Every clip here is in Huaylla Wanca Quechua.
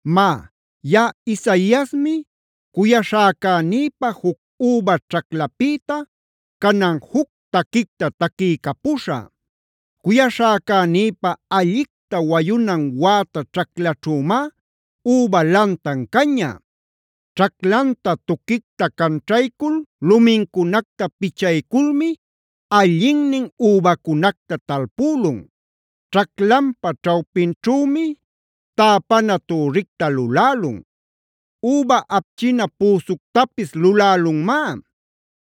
Má, yaꞌa Isaiasmi, cuyaśhäcänïpä juc üba ćhaclapïta canan juc taquicta taquiycapuśhä: Cuyaśhäcänïpä allicta wayunan wäta ćhaclaćhümá üba lantan caña. Ćhaclanta tuquicta canćhaycul lumincunacta pichayculmi allinnin übacunacta talpülun. Ćhaclanpa ćhawpinćhümi täpana türricta lulälun; üba apchina püsuctapis lulälunmá.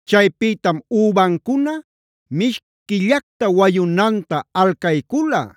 Chaypïtam übancuna mishquillacta wayunanta alcaycula;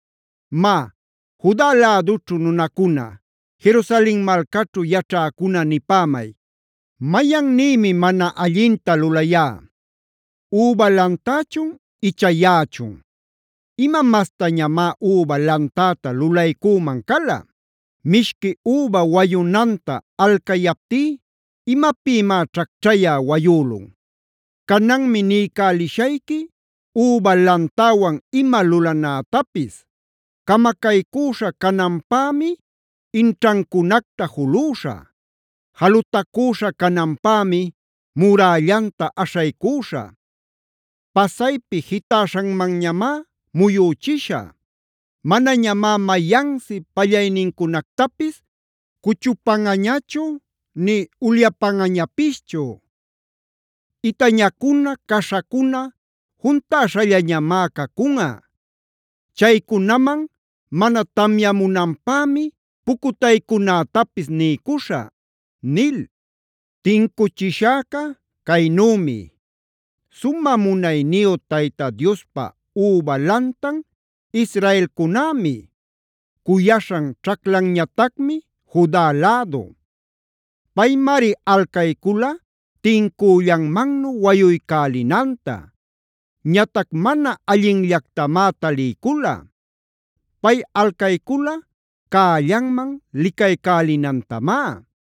Má, Juda lädućhu nunacuna, Jerusalen malcaćhu yaćhäcuna nipämay: “¿Mayannïmi mana allinta lulayá? ¿Üba lantächun icha yaꞌachun? ¿Ima mastañamá üba lantäta lulaycüman cala? Mishqui üba wayunanta alcayaptí, ¿imapïmá ćhacćhayä wayülun? “Cananmi niycälishayqui üba lantäwan ima lulanätapis: Camacaycüśha cananpämi, inćhancunacta julüśhä; jalutacüśha cananpämi murällanta aśhaycüśhä. Pasaypi jitäśhamanñamá muyüchishä. Manañamá mayansi pallaynincunactapis cuchupanꞌañachu nï ulyapanꞌañapischu. Itañacuna, caśhacuna juntäśhallañamá cacunꞌa. Chaycunaman mana tamyamunanpämi pucutaycunätapis niycuśhä” nil. Tincuchishäca caynümi: Sumä munayniyu Tayta Diospa üba lantan israelcunämi. Cuyaśhan ćhaclanñatacmi Juda lädu. Paymari alcaycula tincüllanmannu wayuycälinanta. Ñatac mana allinllactamá taliycula. Pay alcaycula cällanman licaycälinantamá.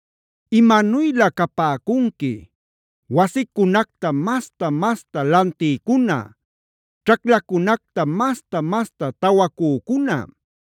¡Imanuylä capäcunqui, wasicunacta masta-masta lantïcuna, ćhaclacunacta masta-masta tawacücuna!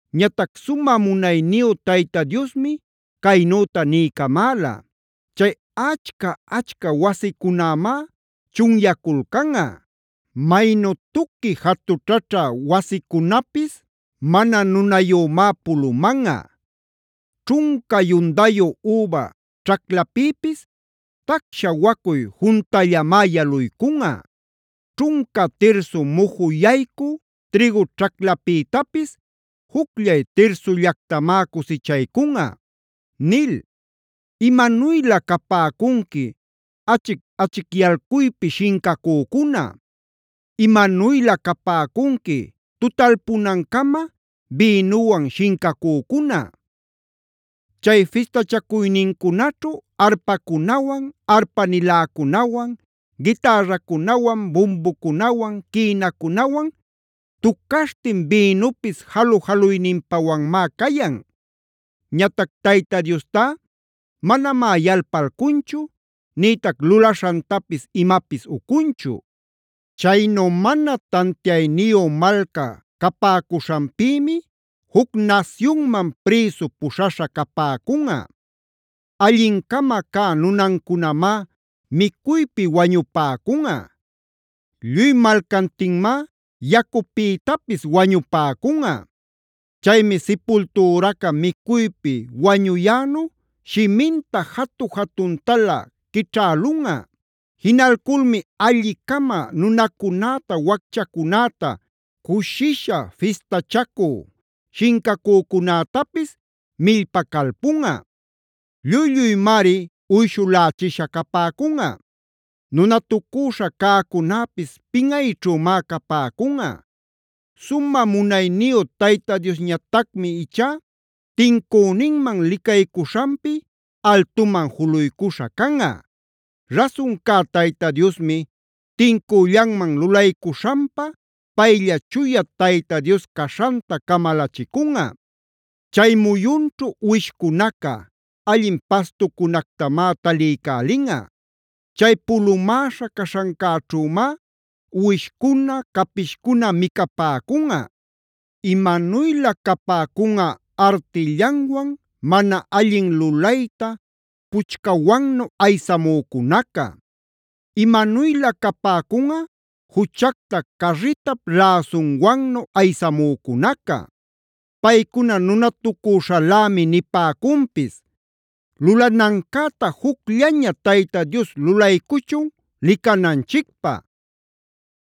Ñatac sumä munayniyu Tayta Diosmi caynüta niycamäla: “Chay achca-achca wasicunämá chunyaculcanꞌa. Maynu tuqui jatućhaćhä wasicunapis mana nunayümá pulumanꞌa. Ćhunca yundayu üba ćhaclapïpis, tacsha wacuy juntallamá yaluycunꞌa. Ćhunca tirsu muju yaycü trïgu ćhaclapïtapis, jucllay tirsullactamá cusichaycunꞌa” nil. ¡Imanuylä capäcunqui achic-achicyalcuypi shincacücuna! ¡Imanuylä capäcunqui tutalpunancama bïnuwan shincacücuna! Chay fistachacuynincunaćhu arpacunawan, arpa-niläcunawan, gitärracunawan, bumbucunawan, quïnacunawan tucaśhtin bïnupis jalu-jaluyninpawanmád cayan. Ñatac Tayta Diostá manamá yalpalcunchu, nïtac lulaśhantapis imapis ucunchu. Chaynu mana tantiayniyu malca capäcuśhanpïmi juc nasyunman prïsu puśhaśha capäcunꞌa. Allin-cama cä nunancunamá micuypi wañupäcunꞌa; lluy malcantinmá yacupïtapis wañupäcunꞌa. Chaymi sipultüraca micuypi wañuyänu shiminta jatu-jatuntalä quićhälunꞌa. Jinalculmi alli-cama nunacunäta, wacchacunäta, cushisha fistachacü shincacücunätapis millpacalpunꞌa. Lluy-lluymari uyshulächisha capäcunꞌa. Nunatucüśha cäcunäpis pinꞌayćhümá capäcunꞌa. Sumä munayniyu Tayta Diosñatacmi ichá tincüninman licaycuśhanpi altuman juluycuśha canꞌa; Rasun cä Tayta Diosmi tincüllanman lulaycuśhanpa, paylla chuya Tayta Dios caśhanta camalachicunꞌa. Chay muyunćhu uwishcunaca allin pastucunactamá taliycälinꞌa;e chay pulumäśha caśhancäćhümá uwishcuna, capishcuna micapäcunꞌa. ¡Imanuylä capäcunꞌa artillanwan mana allin lulayta puchcawannu aysamücunaca! ¡Imanuylä capäcunꞌa juchacta carritap läsunwannu aysamücunaca! Paycuna nunatucüśhalämi nipäcunpis: “Lulanancäta jucllaña Tayta Dios lulaycuchun licananchicpä.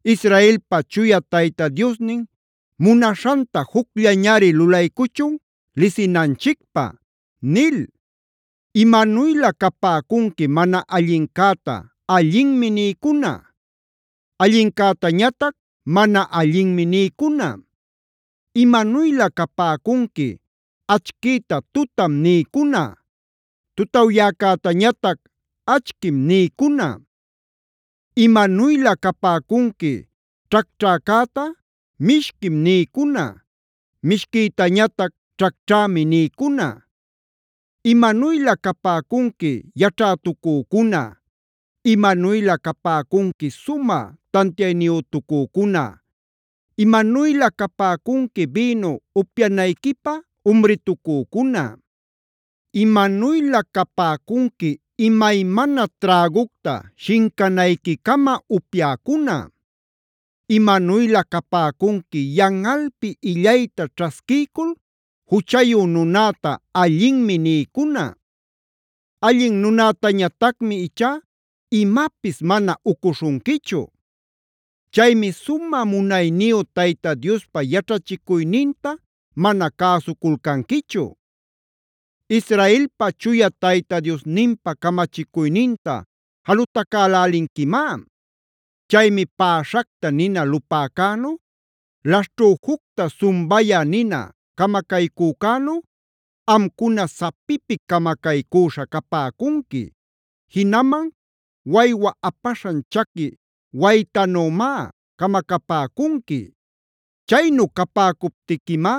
Israelpa Chuya Tayta Diosnin munaśhanta jucllañari lulaycuchun lisinanchicpä” nil. ¡Imanuylä capäcunqui mana allincäta “allinmi” nïcuna; allincätañatac “mana allinmi” nïcuna! ¡Imanuylä capäcunqui achquïta “tutam” nïcuna; tutawyaycätañatac “achquim” nïcuna! ¡Imanuylä capäcunqui ćhacćhäcäta “mishquim” nïcuna; mishquïtañatac “ćhacćhämi” nïcuna! ¡Imanuylä capäcunqui yaćhätucücuna! ¡Imanuylä capäcunqui sumä tantiayniyütucücuna! ¡Imanuylä capäcunqui bïnu upyanayquipä umritucücuna! ¡Imanuylä capäcunqui imaymana trägucta shincanayquicama upyäcuna! Imanuylä capäcunqui yanꞌalpi illayta ćhasquiycul, juchayu nunäta “allinmi” nïcuna. Allin nunätañatacmi ichá imapis mana ucuśhunquichu. Chaymi sumä munayniyu Tayta Diospa yaćhachicuyninta mana cäsuculcanquichu. Israelpa Chuya Tayta Diosninpa camachicuyninta jalutacälälinquimá. Chaymi päśhacta nina lupäcänu, laśhćhüjucta sumbayä nina camacaycücänu, amcuna sapipi camacaycüśha capäcunqui, jinaman waywa apaśhan chaqui waytanümi camacapäcunqui. Chaynu capäcuptiquimá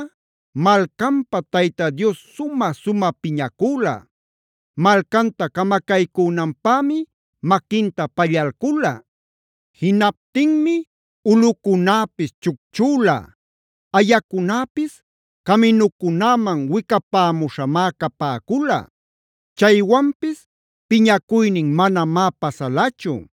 malcanpä Tayta Dios sumä-sumä piñacüla; malcanta camacaycünanpämi maquinta pallalcula. Jinaptinmi ulꞌucunäpis chucchüla; ayacunäpis caminucunäman wicapämuśhamá capäcula. Chaywanpis piñacuynin manamá pasalachu.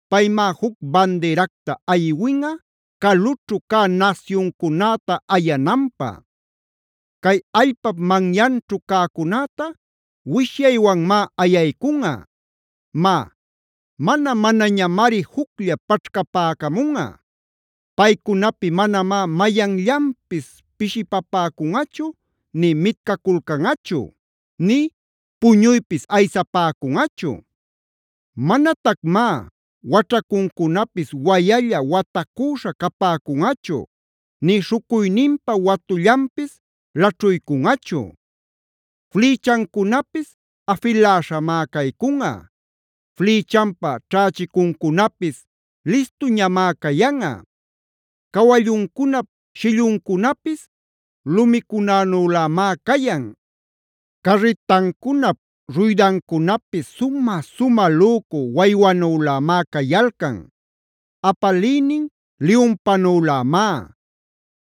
Paymá juc bandiracta aywinꞌa calućhu cä nasyuncunäta ayananpä; cay allpap manyanćhu cäcunäta wishyaywanmá ayaycunꞌa. Má, mana-manañamari juclla paćhcapäcamunꞌa. Paycunapi manamá mayanllanpis pishipapäcunꞌachu nï mitcaculcanꞌachu, nï puñuypis aysapäcunꞌachu. Manatacmá waćhacuncunapis wayalla watacüśhá capäcunꞌachu nï śhucuyninpa watullanpis laćhuycunꞌachu. Flïchancunapis afiläśhamá caycunꞌa, flïchanpa ćhächicuncunapis listuñamá cayanꞌa. Cawalluncunap shilluncunapis lumicunanülämá cayan; carritancunap ruydancunapis sumä-sumä lücu waywanülämá cayalcan. Apaliynin liyunpanülämá;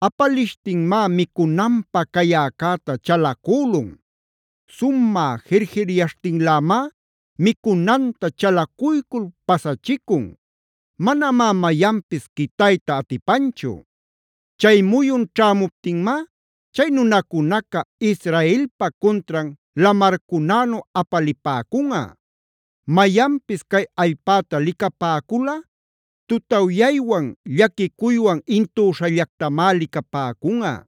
apalishtinmá micunanpä cayäcäta chalacülun; sumä jir-jiryaśhtinlämá micunanta chalacuycul pasachicun; manamá mayanpis quitayta atipanchu. Chay muyun ćhämuptinmá chay nunacunaca Israelpa cuntran lamarcunänu apalipäcunꞌa. Mayanpis cay allpäta licapäculꞌa, tutawyaywan llaquicuywan intüśhallactamá licapäcunꞌa.